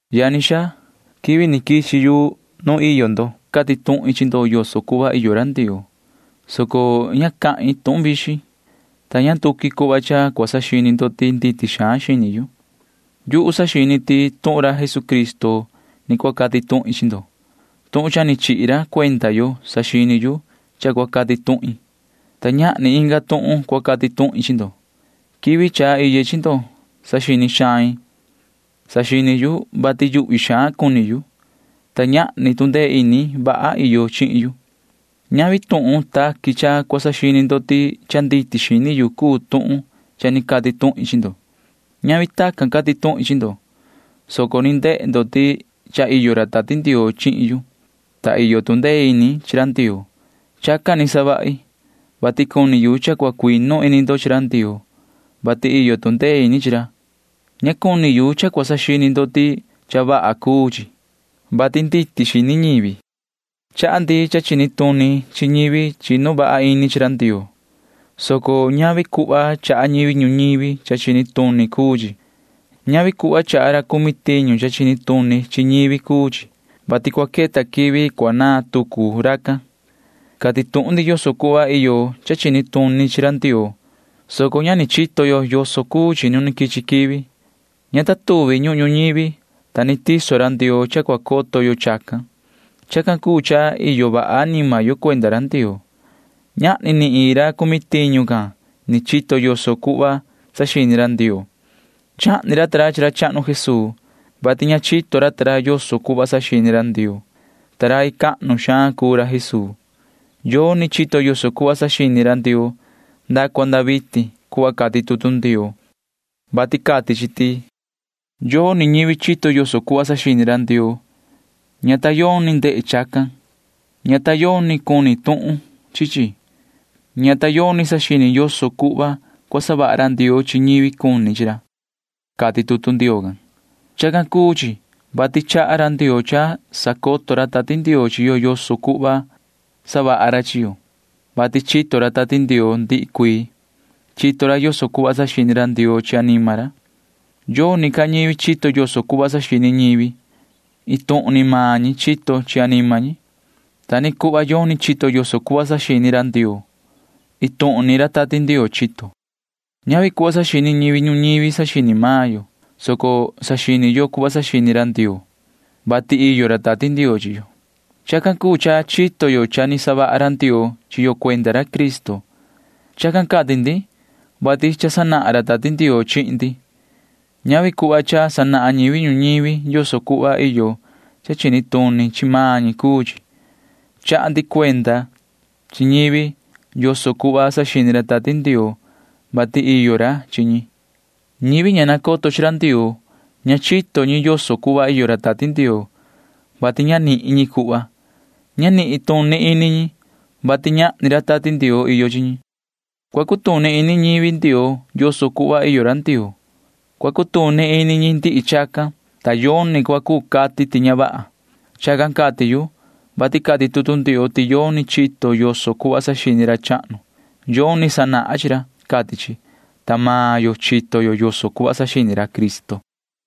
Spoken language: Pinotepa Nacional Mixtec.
Yani xaa, quivi ni quichi yu nu iyo ndo cati tuhin chi ndo yoso cuhva iyo ra Ndioo, soco ña cahin tuhun vixin, ta ni ña nduqui cuhva cha cua saxini ndo ti nditi xaan xini yu. Yuhu saxini ti tuhun ra Jesucristo ni cua cati tuhin chi ndo. Tuhun cha ni chihi ra cuenda yo saxini yu cha cua cati tuhin, ta ñahni inga tuhun cua cati tuhin chi ndo. Quivi cha iye chi ndo saxini xain. Saxini yu, vati yuhvi xaan cuni yu, ta ñahni tu ndee ini vaha iyo chihin yu. Ñavi tuhun taqui cha cua saxini ndo ti cha nditi xini yu cuu tuhun cha ni cati tuhin chi ndo. Ñavi tacan cati tuhin chi ndo, soco ni ndehe ndo ti cha iyo ra Tati Ndioo chihin yu, ta iyo tu ndee ini chi ra Ndioo. Chacan ni savahi, vati cuni yu cha cua cuinu ini ndo chi ra Ndioo, vati iyo tu ndee ini chi ra. Ña cuni yu cha cua saxini ndo ti cha vaha cuu chi, vati nditi xini ñivi. Chaha ndi cha chini tuni chi ñivi chinu vaha ini chi ra Ndioo, soco ñavi cuhva chaha ñivi ñuñivi cha chini tuni cuu chi. Ñavi cuhva chaha ra cumi tiñu cha chini tuni chi ñivi cuu chi, vati cua queta quivi cua naan tucu racan. Cati tuhun ndi yoso cuhva iyo cha chini tuni chi ra Ndioo, soco ña ni chito yo yoso cuu chi nu ni quichi quivi. Ña ta tuvi ñuhun ñuñivi, ta ni tiso ra Ndioo cha cua coto yo chacan. Chacan cuu cha cha iyo vaha anima yo cuenda ra Ndioo. Ñahni ni iin ra cumi tiñu can ni chito yoso cuhva saxini ra Ndioo. Chahni ra ta ra chi ra chahnu Jesuu, vati ña chito ra ta ra yoso cuhva saxini ra Ndioo, ta rai cahnu xaan cuu ra Jesuu. Yoni chito yoso cuhva saxini ra Ndioo nda cua nda vitin cuhva cati tutu Ndioo, vati cati chi ti: Yoni ñivi chito yoso cuhva saxini ra Ndioo. Ña ta yoni ndehe chacan. Ña ta yoni cuni tuhun chi chi. Ña ta yoni saxini yoso cuhva cua savaha ra Ndioo chi ñivi cuni chi ra, cati tutu Ndioo can. Chacan cuu chi, vati chaha ra Ndioo cha sacoto ra Tati Ndioo chi yo yoso cuhva cua savaha ra chi yo, vati chito ra Tati Ndioo ndihi cuii. Chito ra yoso cuhva saxini ra Ndioo chi anima ra. Yoni ca ñivi chito yoso cuhva saxini ñivi. Iin tuhun ni maan ñi chito chi anima ñi. Ta ni cuhva yoni chito yoso cuhva saxini ra Ndioo. Iin tuhun ni ra Tati Ndioo chito. Ñavi cuhva saxini ñivi ñuñivi saxini maan yo, soco saxini yo cuhva saxini ra Ndioo, vati iyo ra Tati Ndioo chi yo. Chacan cuu cha chito yo cha ni savaha ra Ndioo chi yo cuenda ra Cristo. Chacan cati ndi, vati cha sanahan ra Tati Ndioo chihin ndi. Ñavi cuhva cha sanahan ñivi ñuñivi yoso cuhva iyo cha chini tuni chi maan ñi cuu chi. Chaha ndi cuenda chi ñivi yoso cuhva saxini ra Tati Ndioo, vati iyo ra chi ñi. Ñivi ña nacoto chi ra Ndioo―ña chito ñi yoso cuhva iyo ra Tati Ndioo, vati ña nihin ñi cuhva. Ña nituni ini ñi, vati ñahni ra Tati Ndioo iyo chi ñi. Cua cutuni ini ñivi Ndioo yoso cuhva iyo ra Ndioo. Cua cutuni ini ñi ndihi chacan, ta yoni cua cuu cati ti ña vaha. Chacan cati yu, vati cati tutu Ndioo ti yoni chito yoso cuhva saxini ra chahnu. Yoni sanahan chi ra, cati chi. Ta maan yo chito yo yoso cuhva saxini ra Cristo.